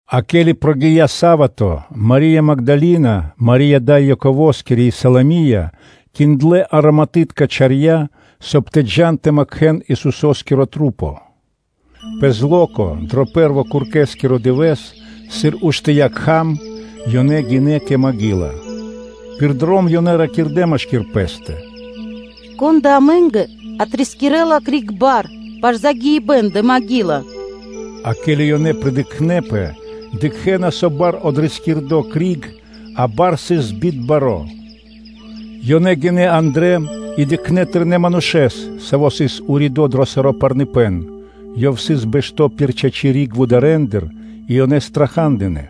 А ке́ли прогия́ са́вато (субо́та), Мари́я Магдалина, Мари́я дай Яковоскири и Саломия, киндлэ ароматытка чарья́, соб (кай) тэ джа́н тэ макхэн Исусо́скиро тру́по. Пэ зло́ко, дро пэ́рво куркэскиро дывэ́с, сыр уштыя́ кхам, ёнэ гинэ́ кэ маґила. Пир дром ёнэ ракирдэ́ машки́р пэ́стэ: “Кон да амэ́нгэ отрискирэла криг бар пашы́л загиибэ́н дрэ копли́ца? А ке́ли ёнэ придыкхнэпэ, дыкхэ́на, со бар отрискирдо криг, а бар сыс древа́н баро́. Ёнэ гинэ́ андрэ́ и дыкхнэ́ тэрнэ́ манушэ́с, саво́ сыс уридо́ дро саро́ парныпэн; ёв сыс бэшто́ пир чачи́ риг вударэндыр, и ёнэ страха́дынэ.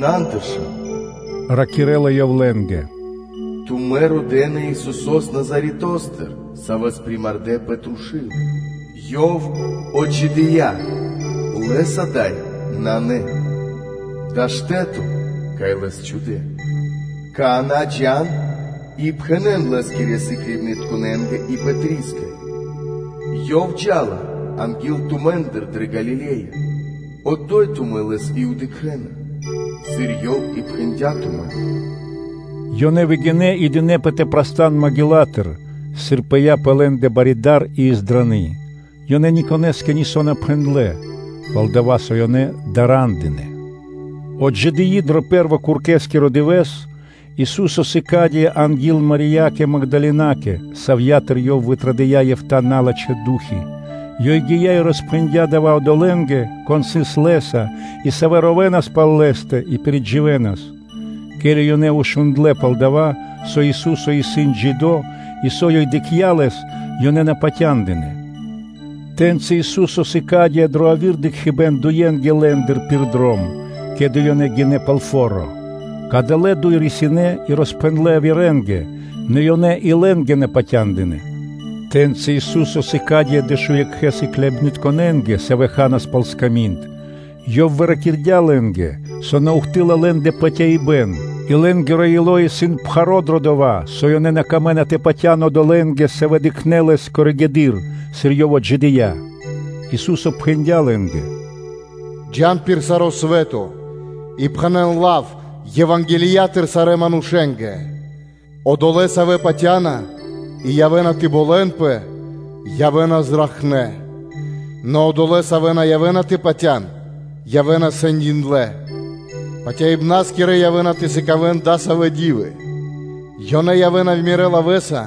“На андыршан”, – ракирэ́ла ёв лэ́нгэ. “Тумэ́ родэ́на Исусо́с Назаретостыр, Савэс примардэ пэ трушу́л. Ёв отджидыя́! Лэс ада́й нанэ, дава́ исын штэ́то, кай Лэс чхудэ́. Какана́ джа́н и пхэнэ́н Лэ́скирэ сыкляибнытконэ́нгэ и Пэтрискэ: “Ёв джа́ла анги́л тумэ́ндэ дрэ Галиле́я, одо́й тумэ́ Лэс и дыкхэ́на, сыр Ёв и пхэндя́ тумэ́нгэ.” Ёнэ выгинэ́ и дынэпэ тэ прастан маґилатыр, сыр пыя́ пэ лэ́ндэ бари дар и издраны; ёнэ никонэ́скэ нисо́ на пхэндлэ́, пал-дова́ со ёнэ дара́ндынэ. Отджидыи дро пэ́рво куркэскиро дывэ́с, Ису́со сыкадыя́ анги́л Мариякэ Магдалинакэ, савья́тыр Ёв вытрадыя́ эфта́ налачхэ́ ду́хи (фаны). Ёй гия́ и роспхэндя́ дава́ одолэ́нгэ, кон сыс Лэ́са и савэ́ ровэнас пал Лэ́стэ и пиридживэнас; ке́ли ёнэ шундлэ́ пал дова́, со Ису́со исын джидо́ и, со ёй дыкхця́ Лэс, ёнэ на патяндынэ́. Тэ́ньци Ису́со сыкадыя́ дро яви́р дыкхибэ́н дуенгэ лэ́ндыр пир дром, ке́ли ёнэ гинэ́ пал фо́ро. Кадалэ́ дуй мануша́ рисинэ́ и роспхэндлэ́ явирэ́нгэ, нэ ёнэ и лэ́нгэ на патяндынэ́. Тэ́ньци Ису́со сыкадыя́ дэшуекхэ сыкляибнытконэ́нгэ, савэ́ ханас пал сками́нд. Ёв выракирдя лэ́нгэ, со на ухты́лла (на́доси) лэ́ндэ патяибэ́н и лэ́нгиро ило́ исын пхаро́ дро дова́, со лэ́нгэ сыс на пир ило́ тэ патя́н одолэ́нгэ, савэ́ дыкхнэ́ Лэс коригэды́р (позжэды́р), сыр Ёв отджидыя́. Ису́со пхэндя́ лэ́нгэ: “Джа́н пир саро́ свэ́то (лот) и пхэнэ́н лав Евангелиятыр кажнонэ́ джидэ́ создыибнаскэ. Одолэ́, савэ́ патя́на и явэ́на тэ болэнпэ, явэ́на зракхнэ́. Нэ одолэ́, савэ́ на явэ́на тэ патя́н-явэ́на сэндиндлэ. Патяибнаскирэ явэ́на тэ сыкавэ́н дасавэ́ ди́вы: ёнэ явэ́на Мирэ́ лавэ́са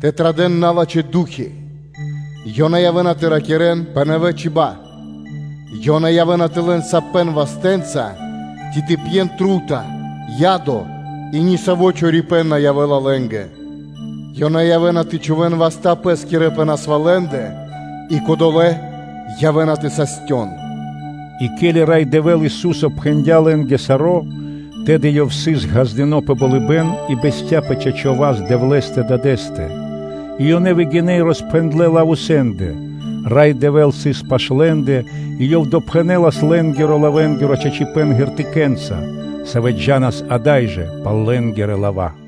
тэ традэ́н налачхэ́ ду́хи, ёнэ явэ́на тэ ракирэ́н пэ нэвэ чиба́ (чибья́); ёнэ явэ́на тэ лэн сапэн вастэ́нца ци тэ пьен трута (отрава) и ни саво́ чорипэ́н на явэ́ла лэ́нгэ, ёнэ явэ́на тэ чхувэ́н васта́ пэ́скирэ пэ насвалэндэ, и кодолэ́ явэ́на тэ састён.” И ке́ли Рай Дэвэ́л Ису́со пхэндя́ лэ́нгэ саро́, тэды Ёв сыс ґаздыно́ пэ болыбэ́н и бэсця́ пэ чачо́ васт Дэвлэ́стэ Дадэ́стэ. И ёнэ выгинэ́ и роспхэндлэ́ лав усенде (везде), Рай Дэвэ́л сыс пашы́л лэ́нгирэ рэ́нды и Ёв допхэнэлас лэ́нгирэ лавэнгиро чачипэ́н знамение́нца (ґертыкэ́нца), савэ́ джа́нас ада́й жэ пал лэ́нгирэ лава́.